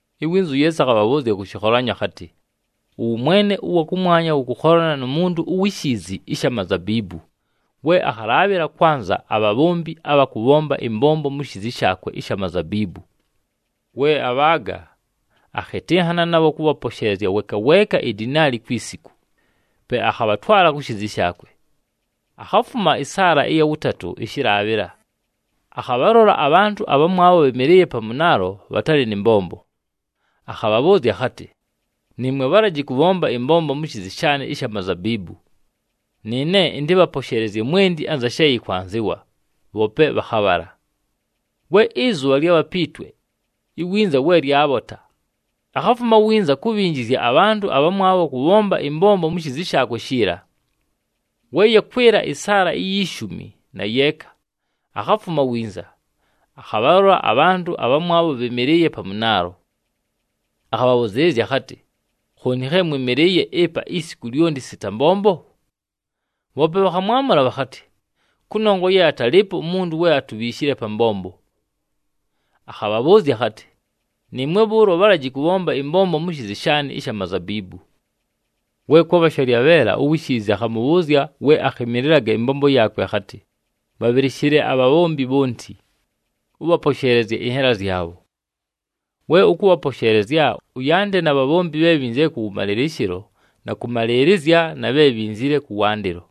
Iwinza uYeesu akhabhabhʉʉzya kʉ shɨkholanyo akhatɨ, “Ʉwʉmwene ʉwa kʉmwanya wʉkʉkholana nu muntu uwi shiizi ɨsha mazabiibu, we akhalaabhɨla kwanza abhabhombi abha kʉbhomba ɨmbombo mu shiizi shaakwe ɨsha mazabiibu. We abhaaga, akhɨtɨnhana nabho kʉbhaposheelezya weeka weeka idinaali kwi siku, pe akhabhatwala ku shiizi shaakwe. Akhafuma ɨsaala ɨya wʉtatʉ ɨshɨlaabhɨla, akhabhalola abhantʉ abhamwabho bhɨmɨlɨɨye pa mʉnaalo, bhatalɨ nɨ mbombo. Akhabhabhʉʉzya akhatɨ, ‘Nɨɨmwe bhalaji kʉbhomba ɨmbombo mu shiizi shaanɨ ɨsha mazabiibu. Nɨɨne ɨntɨbhaposheelezye mwenti anza she yɨkwanzɨwa, bhoope bhakhabhala.’ We ɨzʉbha lyabha pi twe, iwinza we lyabhota, akhafuma winza kubhinjizya abhantʉ abhamwabho kʉbhomba ɨmbombo mu shiizi shaakwe shiila. We yakwɨla ɨsaala iyi shumi na yeeka, akhafuma winza, akhabhalola abhantʉ abhamwabho bhɨmɨlɨɨye pa mʉnaalo. Akhabhabhʉzɨɨlɨzya akhatɨ, ‘Khooni khe mwɨmɨlɨɨye ɨpa isiku lyonti sita mbombo?’ Bhoope bhakhamwamʉla bhakhatɨ, ‘Kʉnongwa ye atalɨɨpo umuntu we atubhiishile pa mbombo.’ Akhabhabhʉʉzya akhatɨ, ‘Nɨɨmwe bhʉʉlo bhalaji kʉbhomba ɨmbombo mu shiizi shaanɨ ɨsha mazabiibu.’ “We kwabha shalyabheela, uwi shiizi akhamʉbhʉʉzya we akhɨmɨlɨlaga ɨmbombo yaakwe akhatɨ, ‘Bhabhɨlɨshɨle abhabhombi bhonti, ʉbhaposheelezye ɨnhela zyabho. We ʉkʉbhaposheelezya, ʉyande na bhabhombi bhe bhinzile kʉwʉmalɨlɨshɨlo na kʉmalɨɨlɨzya na bhe bhinzile kʉwandɨlo.’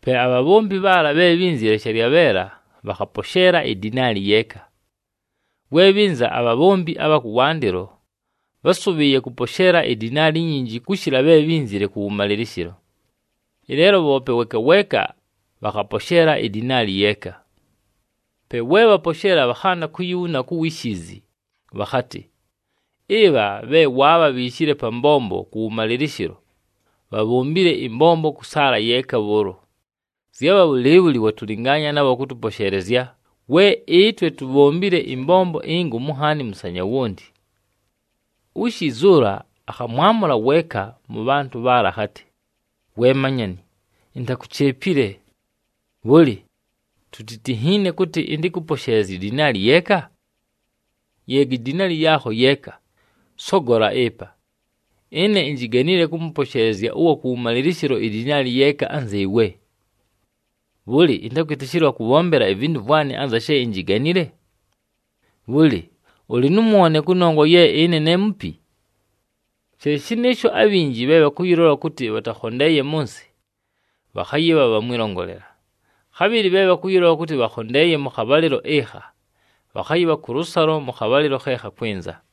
Pe abhabhombi bhaala bhe bhínzile shalyabheela, bhakhaposheela idinaali yeeka. We bhɨnza abhabhombi abha kʉwandɨlo, bhásʉbhɨɨye kʉposheela idinaali inyinji kʉshɨla bhe bhínzile kʉwʉmalɨlɨshɨlo. Ɨleelo bhoope weeka weeka bhakhaposheela idinaali yeeka. Pe we bhaposheela, bhakhanda kuyibhuna ku wi shiizi, bhakhatɨ, ‘Ɨbha bhe waabhabhiishile pa mbombo kʉwʉmalɨlɨshɨlo, bhabhombile ɨmbombo kʉ saala yeeka bhʉʉlo, zyabha bhʉlɨɨbhʉlɨ watʉlɨngaanya nabho kʉtʉposheelezya, we ɨtwe tubhombile ɨmbombo ingomu nhaani mʉsanya wonti.’ Uwi shiizi ʉla akhamwamʉla weeka mʉ bhantʉ bhaala akhatɨ, ‘We manyani, intakucheepile. Bhʉlɨ, tutinhiine kʉtɨ ɨntɨkʉposheelezye idinaali yeeka? Yeega idinaali yaakho yeeka, sogola ɨpa! Ɨne injiganile kʉmʉposheelezya ʉwa kʉwʉmalɨlɨshɨlo idinaali yeeka anzɨɨwe. Bhʉlɨ, ɨntakwɨtɨshɨlwa kʉbhombela ivintu vwanɨ anza she injiganile? Bhʉlɨ ʉlɨ nʉ mwone kʉnongwa ye ne mupi?’ She shɨnɨɨsho, abhinji bhe bhakʉyɨlola kʉtɨ bhatakhondeeye mʉ nsɨ, bhakhayɨbha bha mwɨlongolela, khabhɨlɨ bhe bhakʉyɨlola kʉtɨ bhakhondeeye mʉ khabhalɨlo ɨkha, bhakhayɨbha kʉlʉsalo mʉ khabhalɨlo khe khakwɨnza.”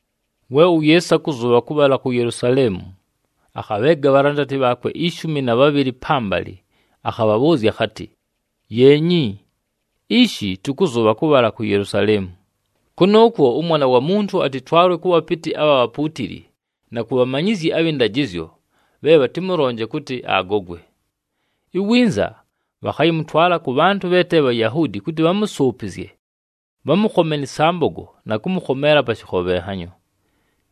We uYeesu akʉzʉbha kʉbhala ku Yelusaleemu, akhabheega abhalandati bhaakwe ishumi na bhabhɨlɨ pambalɨ, akhabhabhʉʉzya akhatɨ, “Yeenyi, ishi tʉkʉzʉbha kʉbhala ku Yelusaleemu. Kʉnʉʉkwo ʉMwana wa Muntu atɨtwalwe kʉ bhapɨtɨ abha bhapuutili na ku bhamanyizyi abhɨ ndajɨzyo bhe bhatɨmʉlonje kʉtɨ agogwe. Iwinza bhakhayɨmʉtwala kʉ bhantʉ bhe te Bhayahuudi kʉtɨ bhamʉsʉʉpɨzye, bhamʉkhome nɨ sambogo na kʉmʉkhomeela pa shɨkhobhenhanyo.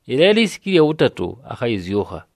Ɨleelo isiku ɨlya wʉtatʉ, akhayɨzyʉkha.”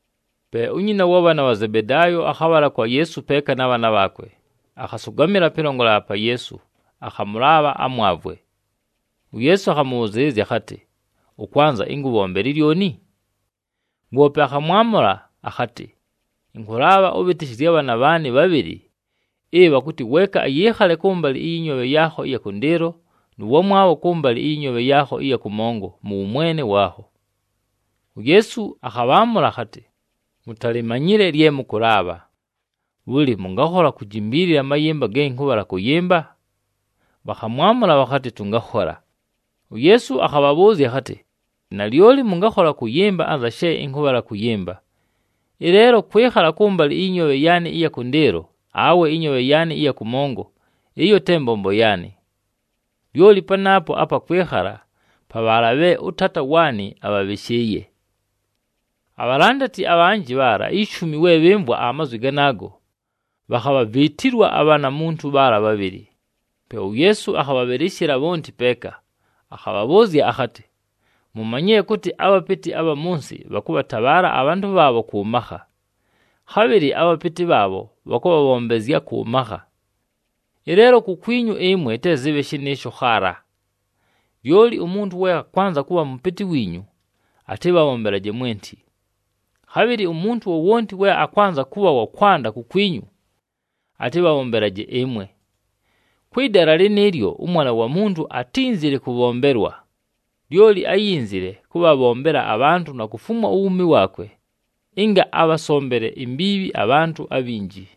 Pe unyina wa bhaana bha Zebedaayo akhabhala kwa Yeesu peeka na bhaana bhaakwe, akhasʉgamɨla pɨlongolela pa Yeesu akhamʉlaabha amwavwe. UYeesu akhamʉbhʉzɨɨlɨzya akhatɨ, “Ʉkwanza ɨnkʉbhombele lyoni?” Woope akhamwamʉla akhatɨ, “Ɨnkʉlaabha ʉbhɨtɨshɨzye abhaana bhaanɨ bhabhɨlɨ ɨbha kʉtɨ weeka ayɨɨkhale kʉmbalɨ ɨyɨ nyoobhe yaakho ɨya kʉndɨɨlo nʉ wamwabho kʉmbalɨ ɨyɨ nyoobhe yaakho ɨya kʉmongo mʉ wʉmwene waakho.” UYeesu akhabhaamʉla akhatɨ, “Mutalimanyile lye mʉkʉlaabha. Bhʉlɨ, mʉngakhola kujimbiilila amayɨmba ge ɨnkʉbhala kʉyɨmba?” Bhakhamwamʉla bhakhatɨ, “Tʉngakhola.” UYeesu akhabhabhʉʉzya akhatɨ, “Nalyoli mʉngakhola kʉyɨmba anza she ɨnkʉbhala kʉyɨmba, ɨleelo kwɨkhala kʉmbalɨ ɨyɨ nyoobhe yaanɨ ɨya kʉndɨɨlo awe ɨnyoobhe yaanɨ ɨya kʉmongo ɨyo te mbombo yaanɨ. Lyoli panaapo apa kwɨkhala pa bhaala bhe ʉTaata waanɨ abhabhɨshɨɨye.” Abhalandati abhanjɨ bhaala ishumi we bhɨmvwa amazwi ganaago, bhakhabhaviitilwa abhanamuntu bhaala bhabhɨlɨ. Pe uYeesu akhabhabhɨlɨshɨla bhonti peeka, akhabhabhʉʉzya akhatɨ, “Mumanyile kʉtɨ abhapɨtɨ abha mʉ nsɨ bhakʉbhatabhaala abhantʉ bhaabho kʉ makha, khabhɨlɨ abhapɨtɨ bhaabho bhakʉbhabhombezya kʉ makha. Ɨleelo kukwinyu ɨmwe te zɨbhe shɨnɨɨsho khaala. Lyoli umuntu we akwanza kʉbha mʉpɨtɨ wiinyu, atɨbhabhombelaje mwenti. Khabhɨlɨ umuntu wowonti we akwanza kʉbha wa kwanda kukwinyu, atɨbhabhombelaje ɨmwe. Kwɨ dala lɨnɨɨlyo, ʉMwana wa Muntu atínzile kʉbhombelwa, lyoli áyinzile kʉbhabhombela abhantʉ na kufumwa uwuumi waakwe ɨnga abhasombele imbiibhi abhantʉ abhinji.”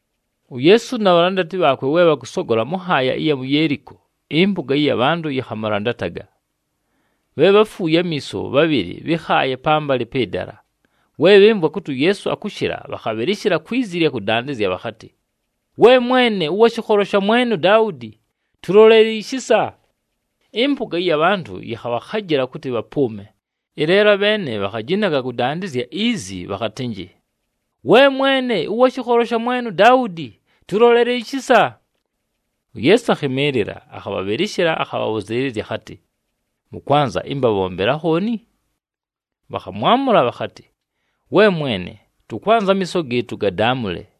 UYeesu na bhalandati bhaakwe we bhakʉsogola mʉ nhaaya ɨya mu Yeeliko, ɨmpʉga ɨya bhantʉ yɨkhamʉlandataga. Bhe bháfuuye amiiso bhabhɨlɨ bhɨ́khaaye pambalɨ pɨ dala, we bhɨmvwa kʉtɨ uYeesu akʉshɨla, bhakhabhɨlɨshɨla kwi zi ɨlya kʉdandɨzya bhakhatɨ, “We Mwene, ʉwa shɨkholo sha mwene uDaudi, tʉlolele ishisa!” Ɨmpʉga ɨya bhantʉ yɨkhabhakhajɨla kʉtɨ bhapʉʉme, ɨleelo abheene bhakhajinaga kʉdandɨzya izi bhakhatɨnjɨ, “We Mwene, ʉwa shɨkholo sha mwene uDaudi, tʉlolele ishisa!” UYeesu akhɨmɨɨlɨla, akhabhabhɨlɨshɨla, akhabhabhʉzɨɨlɨzya akhatɨ, “Mʉkwanza ɨmbabhombele akhooni?” Bhakhamwamʉla bhakhatɨ, “We Mwene, tʉkwanza amiiso gɨɨtʉ gadaamʉle.”